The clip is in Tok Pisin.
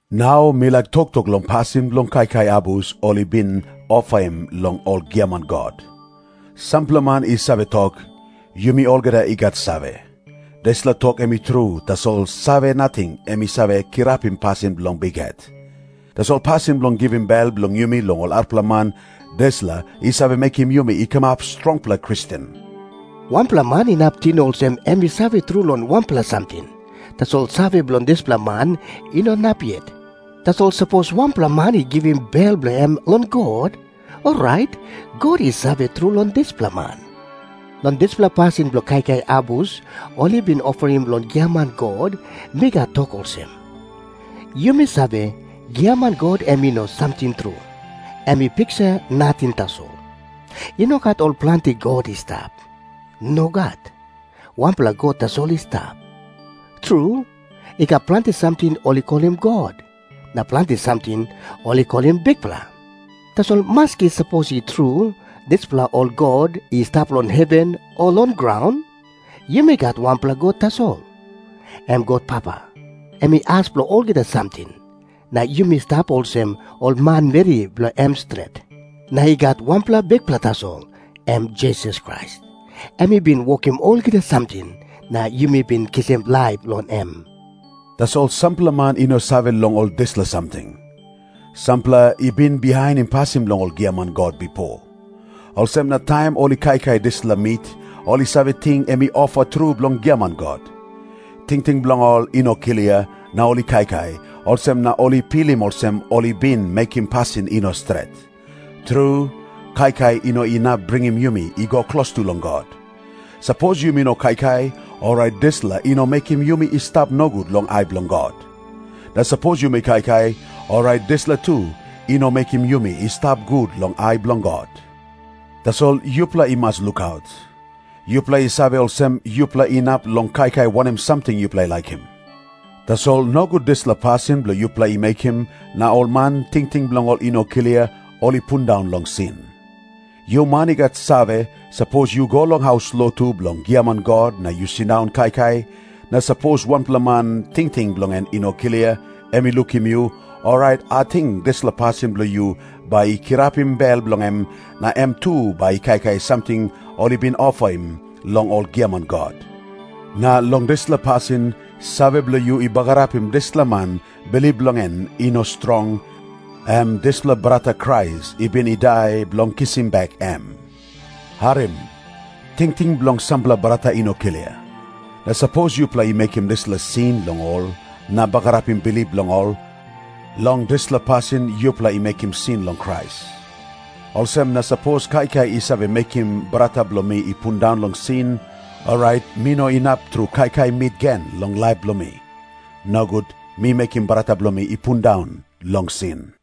Nau mi laik toktok long pasin bilong kaikai abus ol i bin ofaim long ol giaman god. Sampela man i save tok, “Yumi olgeta i gat save.” Dispela tok em i tru, tasol save nating em i save kirapim pasin bilong bikhet. Tasol pasin bilong givim bel bilong yumi long ol arapela man, dispela i save mekim yumi i kamap strongpela Kristen. Wanpela man inap ting olsem em i save tru long wanpela samting, tasol save bilong dispela man i no inap yet. Tasol sapos wanpela man i givim bel bilong em long God, orait God i save tru long dispela man. Long dispela pasin bilong kaikai abus ol i bin ofaim long giaman god, mi gat tok olsem. Yumi save, giaman god em i no samting tru. Em i piksa nating tasol. I no gat ol planti god i stap. Nogat. Wanpela God tasol i stap. Tru, i gat planti samting ol i kolim “god”, na planti samting ol i kolim “bikpela”. Tasol maski sapos i tru dispela ol “god” i stap long heven o long graun, yumi gat wanpela God tasol, em God Papa. Em i as bilong olgeta samting, na yumi stap olsem ol manmeri bilong em stret. Na i gat wanpela Bikpela tasol, em Jisas Krais. Em i bin wokim olgeta samting, na yumi bin kisim laip long em. Tasol sampela man i no save long ol dispela samting. Sampela i bin bihainim pasin bilong ol giaman god bipo. Olsem na taim ol i kaikai dispela mit, ol i save ting em i ofa tru bilong giaman god. Tingting bilong ol i no klia, na ol i kaikai, olsem na ol i pilim olsem ol i bin mekim pasin i no stret. Tru, kaikai i no inap bringim yumi i go klostu long God. Sapos yumi no kaikai, orait dispela i no mekim yumi i stap nogut long ai bilong God. Na sapos yumi kaikai, orait dispela tu i no mekim yumi i stap gut long ai bilong God. Tasol yupela i mas lukaut. Yupela i save olsem, yupela inap long kaikai wanem samting yupela i laikim. Tasol nogut dispela pasin bilong yupela i mekim, na ol man tingting bilong ol i no klia, ol i pundaun long sin. Yu man i gat save, sapos yu go long haus lotu bilong giaman god na yu sindaun kaikai, na sapos wanpela man tingting bilong en i no klia, em i lukim yu, orait ating dispela pasin bilong yu bai i kirapim bel bilong em na em tu bai i kaikai samting ol i bin ofaim long ol giaman god. Na long dispela pasin, save bilong yu i bagarapim dispela man bilip bilong en i no strong, em dispela brata Krais i bin i dai bilong kisim bek em. Harim. Tingting bilong sampela brata i no klia. Na sapos yupela i mekim dispela sin long ol na bagarapim bilip bilong ol, long dispela pasin yupela i mekim sin long Krais. Olsem na sapos kaikai i save mekim brata bilong mi i pundaun long sin, orait mi no inap tru kaikai mit gen long laip bilong mi. Nogut mi mekim brata bilong mi i pundaun long sin.